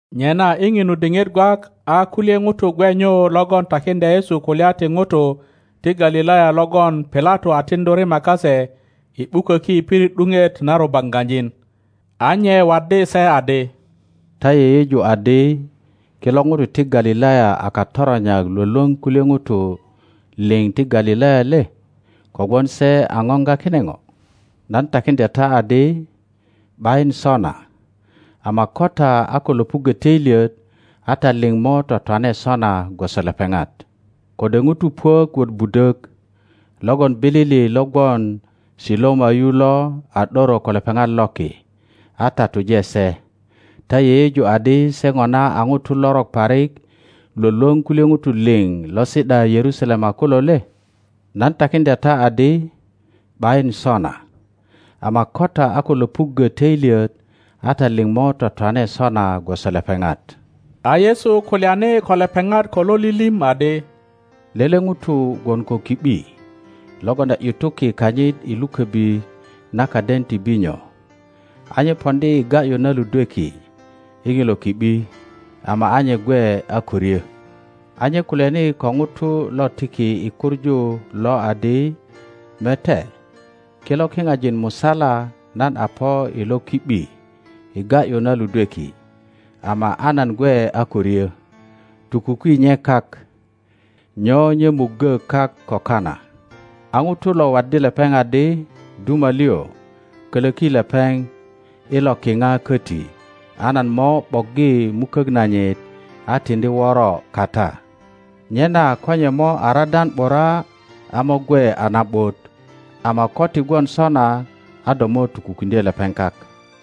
Nyena i ŋinu diŋit gwak a kulye ŋutu gwe nyu logon takiŋdya Yesu kulya ti ŋutu ti Galilaya logon Pilato a tiŋdu rima kase i ’buköki i pirit ’duŋet na rubaŋgajin. A nye waddi se adi, Ta yeyeju adi kilo ŋutu ti Galilaya a katoronyak lwölwöŋ kulye ŋutu liŋ ti Galilaya le, kogwon se a ŋoŋga kine ŋo? Nan takiŋdya ta adi, ’Bayin sona; ama ko ta a ko löpuggö töilyet a ta liŋ mo twatwane sona gwoso lepeŋat. Kode ŋutu puök wot budök logon bilili lo gwon Siloama yu lo a ’doro ko lepeŋat loki a tatuje se, ta yeyeju adi se ŋona a ŋutu lorok parik lwölwöŋ kulye ŋutu liŋ lo si ’da Yerusalema kulo le? Nan takiŋdya ta adi, ’Bayin sona; ama ko ta a ko löpuggö töilyet a ta liŋ mo twatwane sona gwoso lepeŋat. A Yesu kulyani ko lepeŋat ko lo lilim adi, Lele ŋuto gwon ko ki ’bi logon a ’yutuki kanyit i luköbi na kaden ti binyo, a nye poŋdi i ga ’yu na ludweki i ŋilo ki ’bi, ama a nye gwe a ko ryo. A nye kulyani ko ŋuto lo tiki i kuŋu lo adi, Mete, kilo kiŋajin musala nan a po i lo ki ’bi i ga ’yu na ludweki, ama a nan gwe a ko ryö. Tukuki nye kak. Nyo nye muggo kak ko kana? A ŋuto lo waddi lepeŋ adi, Duma liŋ, kölöki lepeŋ i lo kiŋa köti, a nan mo ’boggi mukök nanyit a tiŋdi woro kata; nyena ko nye mo a radan ’bura a mo gwe a na ’but, ama ko ti gwon sona, a do mo tukukiŋdye lepeŋ kak.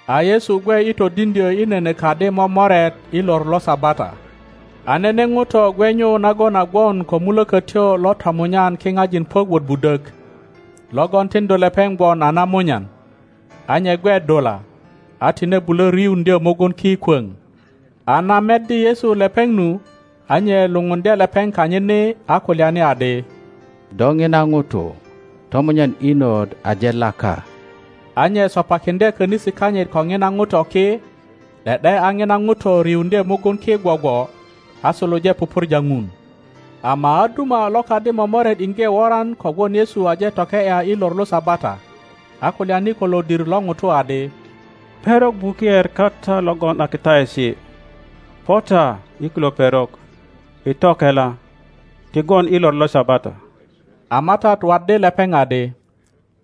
A Yesu gwe i todiŋdyö i nene kadi momoret i lor lo Sabata. A nene ŋuto gwe nyu nagon a gwon ko mulökötyo lo tomunyan kiŋajin puök wot budök, logon tiŋdu lepeŋ gwon a namunyan, a nye gwe dula, a tine bulö riuŋdyö mugun ki kwoŋ. A na meddi Yesu lepeŋ nu, a nye lupundye lepeŋ kanyit ni, a kulyani adi, Do ŋina ŋuto, tomunyan inot aje laka; Da nye sopakiŋdye könisi kanyit ko ŋina ŋuto ki, ’de ’de a ŋina ŋuto riuŋdye mugun ki gwogwo a suluje pupurja Dun. Ama a duma lo kadi momoret iŋge woran kogwon Yesu aje toke ’ya i lor lo Sabata, a kulyani ko lodir lo ŋutu adi, Perok buker kata logon a kitaesi, po ta i kilo perok i tokela, ti gwon i lor lo Sabata. a MATAT waddi lepeŋ adi,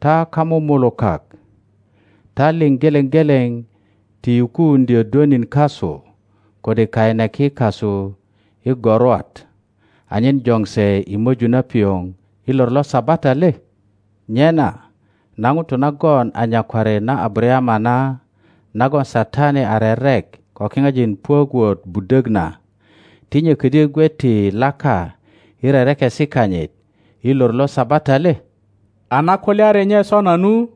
Ta kamumulukak, ta liŋ geleŋ geleŋ ti yukuuŋdyö dwönin kasu kode kaineki kasu i gorwat, anyen joŋ se i möju na pioŋ i lor lo Sabata le? Nyena na ŋuto nagon a nyakwari na Abarayama na, nagon Satani a rerek ko kiŋajin puök wot budök na, ti nye ködyö gwe ti laka i rerekesi kanyit i lor lo Sabata le? A na kulyari nye sona nu,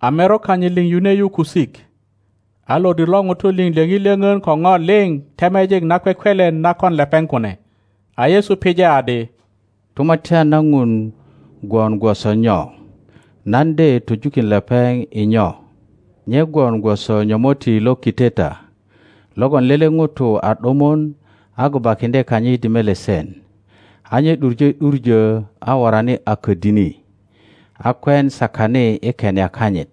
a merok kanyit liŋ yune yu kusik, a lodir lo ŋutu liŋ lyöŋi lyöŋön ko ŋo liŋ temejik nakwekwelen na kon lepeŋ kune. A Yesu pije adi, Tumatyan na Dun gwon gwoso nyo? Nan de töjukin lepeŋ i nyo? Nye gwon gwoso nyomotti lo kiteta logon lele ŋuto a ’dumun a gubakiŋdye kanyit i melesen, a nye ’duŋe ’duŋö a worani a ködini, a kwen sakani i kenia kanyit.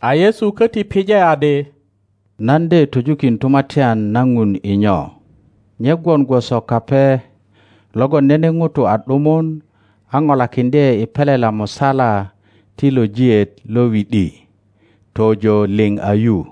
A Yesu köti pije adi, Nan de töjukin Tumatyan na Ŋun i nyo? Nye gwon gwoso kape logon nene ŋuto a ’dumun a polakiŋdye i pelela musala ti lojiet lo wi ’di tojo liŋ a yu.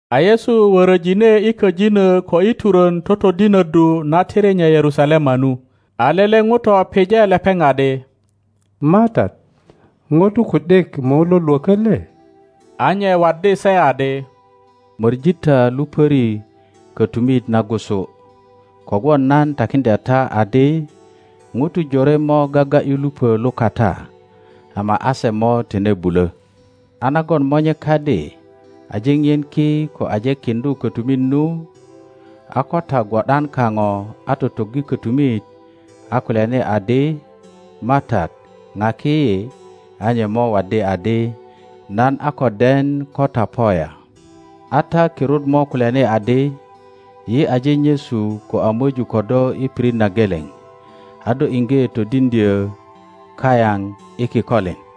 A Yesu wöröjine i köjinö ko i turön totodinöddu na tiri nye Yerusalema nu. A lele ŋuto pije lepeŋ adi, MATAT, ŋutu ku ’dik mo lo lwökö le? A nye waddi se adi, Möŋi ta lupöri kötumit nagusu, kogwon nan takiŋdya ta adi, ŋutu jore mo gaga ’yu lupö lukata ama a se mo tine bulö. a nagon monye kadi aje ŋien ki ko aje kiŋdu kotumit nu, a ko ta gwo ’dan kaŋo a totoggi kotumit, a kulyani adi, MATAT, ŋaki yi, a nye mo waddi adi, Nan a ko den ko ta po ya. A ta kirut mo kulyani adi, Yi aje nyesu ko a möju ko do i piril na geleŋ, a do iŋge todiŋdyo kayaŋ i kikolin.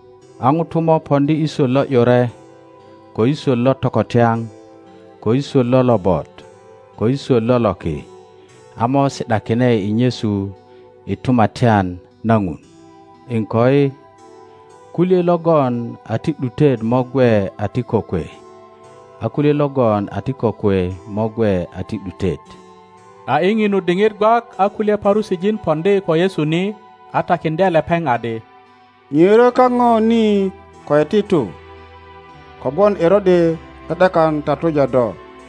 A ŋutu mo poŋdi i swot lo ’yure, ko i swot lo tokotyaŋ, ko i swot lo lobot, ko i swot lo loki, a mo si ’dakine i nyesu i Tumatyan na Ŋun. Iŋkoi, kulye logon a ti ’dutet mo gwe a ti kokwe, a kulye logon a ti kokwe mo gwe a ti ’dutet. A i ŋinu diŋit gwak a kulye Parusijin poŋdi ko Yesu ni, a takiŋdye lepeŋ adi, ŋiöro kaŋo ni ko iti tu; kogwon Erode ’de ’dekan tatuja do.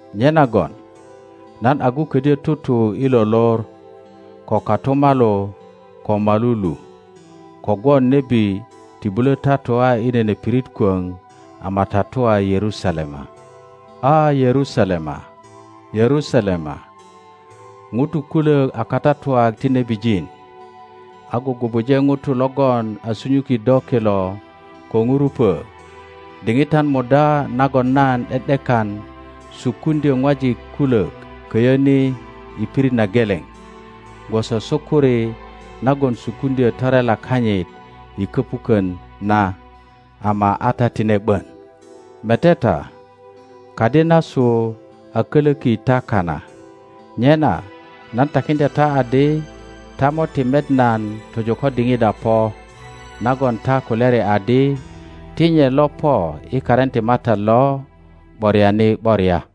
Nyenagon nan agu ködyö tutu i lo lor ko kotumalu ko molu lu, kogwon nebi ti bulo tatua i nene pirit kwöŋ ama tatua Yerusalema. A, Yerusalema, Yerusalema, ŋutu kulök a katatuak ti nebijin, a gugubuje ŋutu logon a sunyuki do kilo ko ŋurupö! Diŋitan muda nagon nan ’de ’dekan sukuŋdyö ŋwajik kulök köyo ni i pirit na geleŋ, gwoso sukuri nagon sukokiŋdyö torela kanyit i köpukön na, ama a ta tine ’bon! Mete ta, kadi nasu a kölöki ta kana. Nyena nan takiŋdya ta adi, ta mo ti met nan tojo ko diŋit a po nagon ta kulyari adi, Ti nye lo po i karin ti MATAT lo ’boriani ’boria.